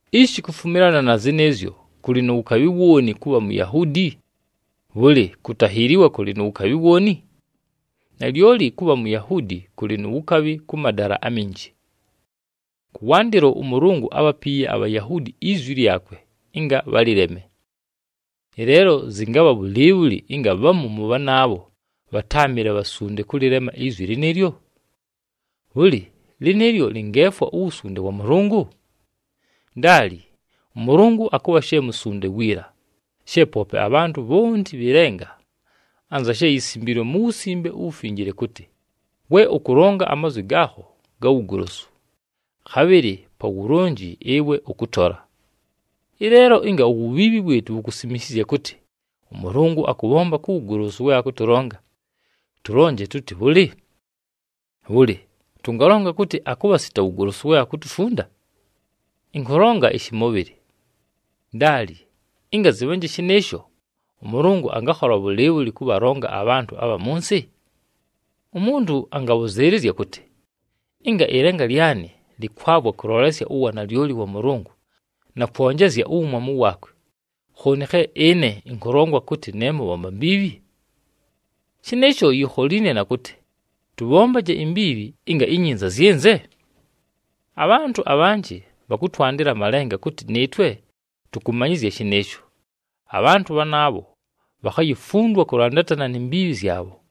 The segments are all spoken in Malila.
Ishi kufumilana na zɨnɨɨzyo, kʉlɨ nu wukabhi wooni kʉbha Muyahuudi? Bhʉlɨ, kutahiiliwa kʉlɨ na wukabhi wooni? Nalyoli kʉbha Muyahuudi kʉlɨ nu wukabhi kʉ madala aminji. Kʉwandɨlo, ʉMʉlʉngʉ ábhapiiye aBhayahuudi izwi lyakwe ɨnga bhalɨleme. Ɨleelo, zɨngabha bhʉlɨɨbhʉlɨ ɨnga bhamu mʉ bhanaabho bhatáamɨle bhasunde kʉlɨlema izwi lɨnɨɨlyo? Bhʉlɨ, lɨnɨɨlyo lɨngeefwa uwusunde wa Mʉlʉngʉ? Ndaali! ɄMʉlʉngʉ akʉbha she musunde wiila, she poope abhantʉ bhonti bhɨ lenga. Anza she yisimbiilwe mu Wusimbe uWufinjile kʉtɨ, “We ʉkʉlonga amazwi gaakho ga wugolosu, khabhɨlɨ pa wulonji, ɨwe ʉkʉtola.” Ɨleelo, ɨnga uwubhiibhi wɨɨtʉ wukusimishizya kʉtɨ, ʉMʉlʉngʉ akʉbhomba ku wugolosu we akʉtʉlonga, tʉlonje tʉtɨ bhʉlɨ? Bhʉlɨ, tʉngalonga kʉtɨ akʉbha sita wugolosu we akutufunda? Ɨnkʉlonga ɨshɨmʉbhɨlɨ. Ndaali! Ɨnga zɨbhanje shɨnɨɨsho, ʉMʉlʉngʉ angakhola bhʉlɨɨbhʉlɨ kʉbhalonga abhantʉ abha mʉ nsɨ? Umuntu angabhʉzɨɨlɨzya kʉtɨ, “Ɨnga ɨlenga lyanɨ lɨkwavwa kʉlolesya uwanalyoli wa Mʉlʉngʉ na kwonjezya uwumwamu waakwe, khooni khe ɨne ɨnkʉlongwa kʉtɨ ne mʉbhomba mbiibhi?” Shɨnɨɨsho yikholiine na kʉtɨ, “Tʉbhombaje imbiibhi ɨnga inyinza zyɨnze?” Abhantʉ abhanjɨ bhakʉtwandɨla amalenga kʉtɨ nɨɨtwe tʉkʉmanyɨzya shɨnɨɨsho. Abhantʉ bhanaabho bhakhayifundwa kʉlandatana ni mbiibhi zyabho.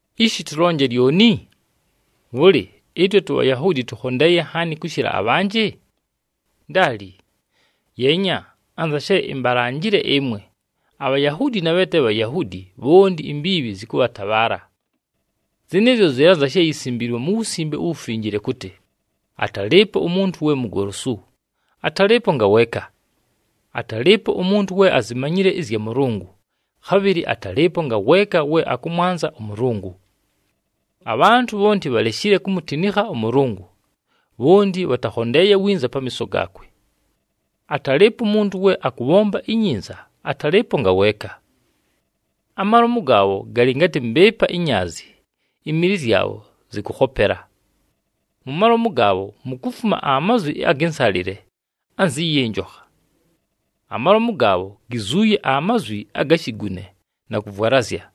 Ishi tʉlonje lyoni? Bhʉlɨ, ɨtwe tuBhayahuudi tʉkhondeeye nhaani kʉshɨla abhanjɨ? Ndaali! Yeenya, anza she imbalanjile ɨmwe, aBhayahuudi na bhe te Bhayahuudi, bhonti imbiibhi zɨkʉbhatabhaala. Zɨnɨɨzyo zɨlɨ anza she yisimbiilwe mu Wusimbe uWufinjile kʉtɨ, “Atalɨɨpo umuntu we mugolosu, atalɨɨpo ngaweeka. Atalɨɨpo umuntu we azimanyile ɨzya Mʉlʉngʉ, khabhɨlɨ atalɨɨpo ngaweeka we akʉmwanza ʉMʉlʉngʉ. Abhantʉ bhonti bhaleshile kumutinikha ʉMʉlʉngʉ, bhonti bhatakhondeeye winza pamiiso gaakwe. Atalɨɨpo umuntu we akʉbhomba inyinza, atalɨɨpo ngaweeka.” “Amalomu gaabho galɨ ngatɨ mbɨɨpa inyaazi, imili zyabho zɨkʉkhopela.” “Mu malomu gaabho, mukufuma amazwi agɨ nsalɨle anzɨ yɨ njokha.” “Amalomu gaabho, gizuuye amazwi aga shigune na kʉvwalazya.”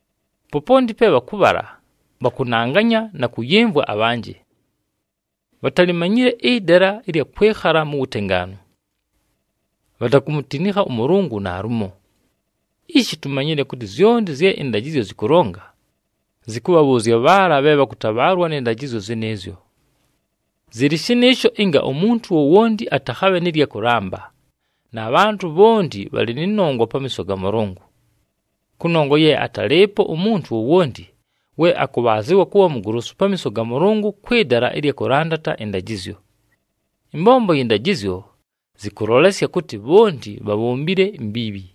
Poponti pe bhakʉbhala, bhakʉnanganya na kʉyɨmvwa abhanjɨ. Bhatalimanyile ɨdala ɨlya kwɨkhala mu wutengaanu.” “Bhatakumutinikha ʉMʉlʉngʉ naalumo.” Ishi tumanyile kʉtɨ zyonti zye ɨndajɨzyo zɨkʉlonga, zɨkʉbhabhʉʉzya bhaala bhe bhakʉtabhaalwa nɨ ndajɨzyo zɨnɨɨzyo. Zɨlɨ shɨnɨɨsho ɨnga umuntu wowonti atakhabhe nɨ lya kʉlamba, na bhantʉ bhonti bhalɨ nɨ nongwa pamiiso ga Mʉlʉngʉ. Kʉnongwa ye atalɨɨpo umuntu wowonti we akʉbhaazɨwa kʉbha mugolosu pamiiso ga Mʉlʉngʉ kwɨ dala ɨlya kʉlandata ɨndajɨzyo. Ɨmbombo yɨ ndajɨzyo zɨkʉlolesya kʉtɨ bhonti bhabhombile imbiibhi.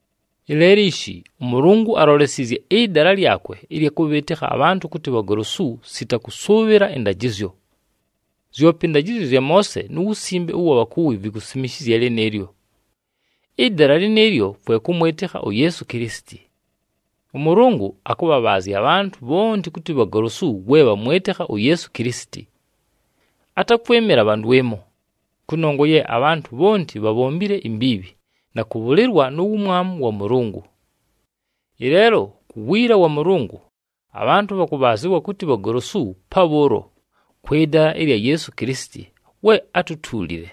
Ɨleelo ishi, ʉMʉlʉngʉ alolesiizye ɨdala lyakwe ɨlya kʉbhɨɨtɨkha abhantʉ kʉtɨ bhagolosu, sita kʉsʉʉbhɨla ɨndajɨzyo. Zyope ɨndajɨzyo zya Moose nu wusimbe ʉwa bhakuwi vikusimishizya lɨnɨɨlyo. Ɨdala lɨnɨɨlyo kwe kʉmwɨtɨkha uYeesu Kilisiti. ɄMʉlʉngʉ akʉbhabhaazya abhantʉ bhonti kʉtɨ bhagolosu we bhamwɨtɨkha uYeesu Kilisiti. Atakwɨmɨla bha ndwɨmo, kʉnongwa ye abhantʉ bhonti bhabhombile imbiibhi, na kʉbhʉlɨlwa nu wumwamu wa Mʉlʉngʉ. Ɨleelo, ku wiila wa Mʉlʉngʉ, abhantʉ bhakʉbhaazɨwa kʉtɨ bhagolosu pabhʉʉlo, kwɨ dala ɨlya Yeesu Kilisiti we átutuulile.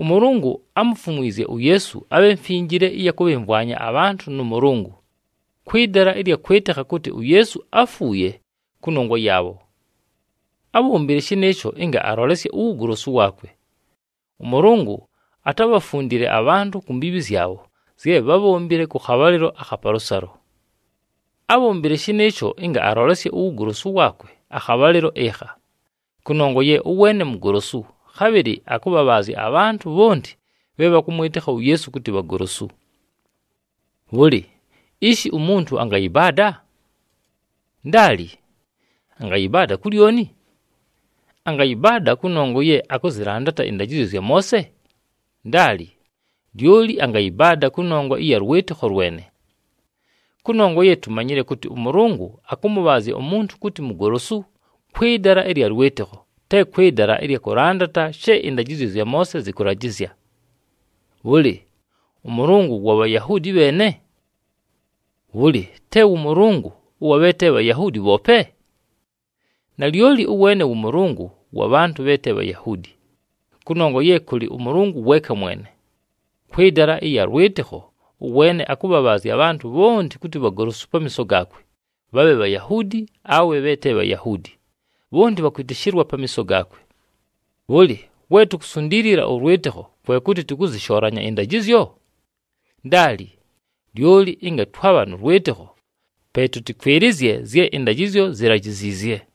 ɄMʉlʉngʉ ámufumwizye uYeesu abhe mfinjile ɨya kʉbhɨmvwanya abhantʉ nʉ Mʉlʉngʉ, kwɨ dala ɨlya kwɨtɨkha kʉtɨ uYeesu áfuuye kʉnongwa yaabho. Ábhombile shɨnɨɨsho ɨnga alolesye uwugolosu waakwe. ɄMʉlʉngʉ atábhafundile abhantʉ ku mbiibhi zyabho zye bhábhombile kʉ khabhalɨlo akha palʉsalo. Abhombile shɨnɨɨsho ɨnga alolesye uwugolosu waakwe akhabhalɨlo ɨkha, kʉnongwa ye ʉweene mugolosu, khabhɨlɨ akʉbhabhaazya abhantʉ bhonti bhe bhakʉmwɨtɨkha uYeesu kʉtɨ bhagolosu. Bhʉlɨ, ishi umuntu angayɨbaada? Ndaali! Angayɨbaada ku lyoni? Angayɨbaada kʉnongwa ye akʉzɨlandata ɨndajɨzyo zya Moose? Ndaali. Lyoli angayɨbaada kʉnongwa ɨya lwɨtɨkho lwene. Kʉnongwa ye tumanyile kʉtɨ ʉMʉlʉngʉ akʉmʉbhaazya umuntu kʉtɨ mugolosu kwɨ dala ɨlya lwɨtɨkho, te kwɨ dala ɨlya kʉlandata she ɨndajɨzyo zya Moose zɨkʉlajɨzya. Bhʉlɨ, ʉMʉlʉngʉ wa Bhayahuudi bheene? Bhʉlɨ, te wʉ Mʉlʉngʉ ʉwa bhe te Bhayahuudi bhoope? Nalyoli ʉweene wʉ Mʉlʉngʉ wa bhantʉ bhe te Bhayahuudi, kʉnongwa ye kʉlɨ ʉMʉlʉngʉ weeka mwene. Kwɨ dala ɨlya lwɨtɨkho, ʉweene akʉbhabhaazya abhantʉ bhonti kʉtɨ bhagolosu pamiiso gaakwe, bhabhe Bhayahuudi awe bhe te Bhayahuudi, bhonti bhakwɨtɨshɨlwa pamiiso gaakwe. Bhʉlɨ, we tukusundiilila ʉlwɨtɨkho, kwe kʉtɨ tʉkʉzɨshoolanya ɨndajɨzyo? Ndaali! Lyoli ɨnga twabha nʉ lwɨtɨkho, pe tʉtɨkwɨlɨzye zye ɨndajɨzyo zilajiziizye.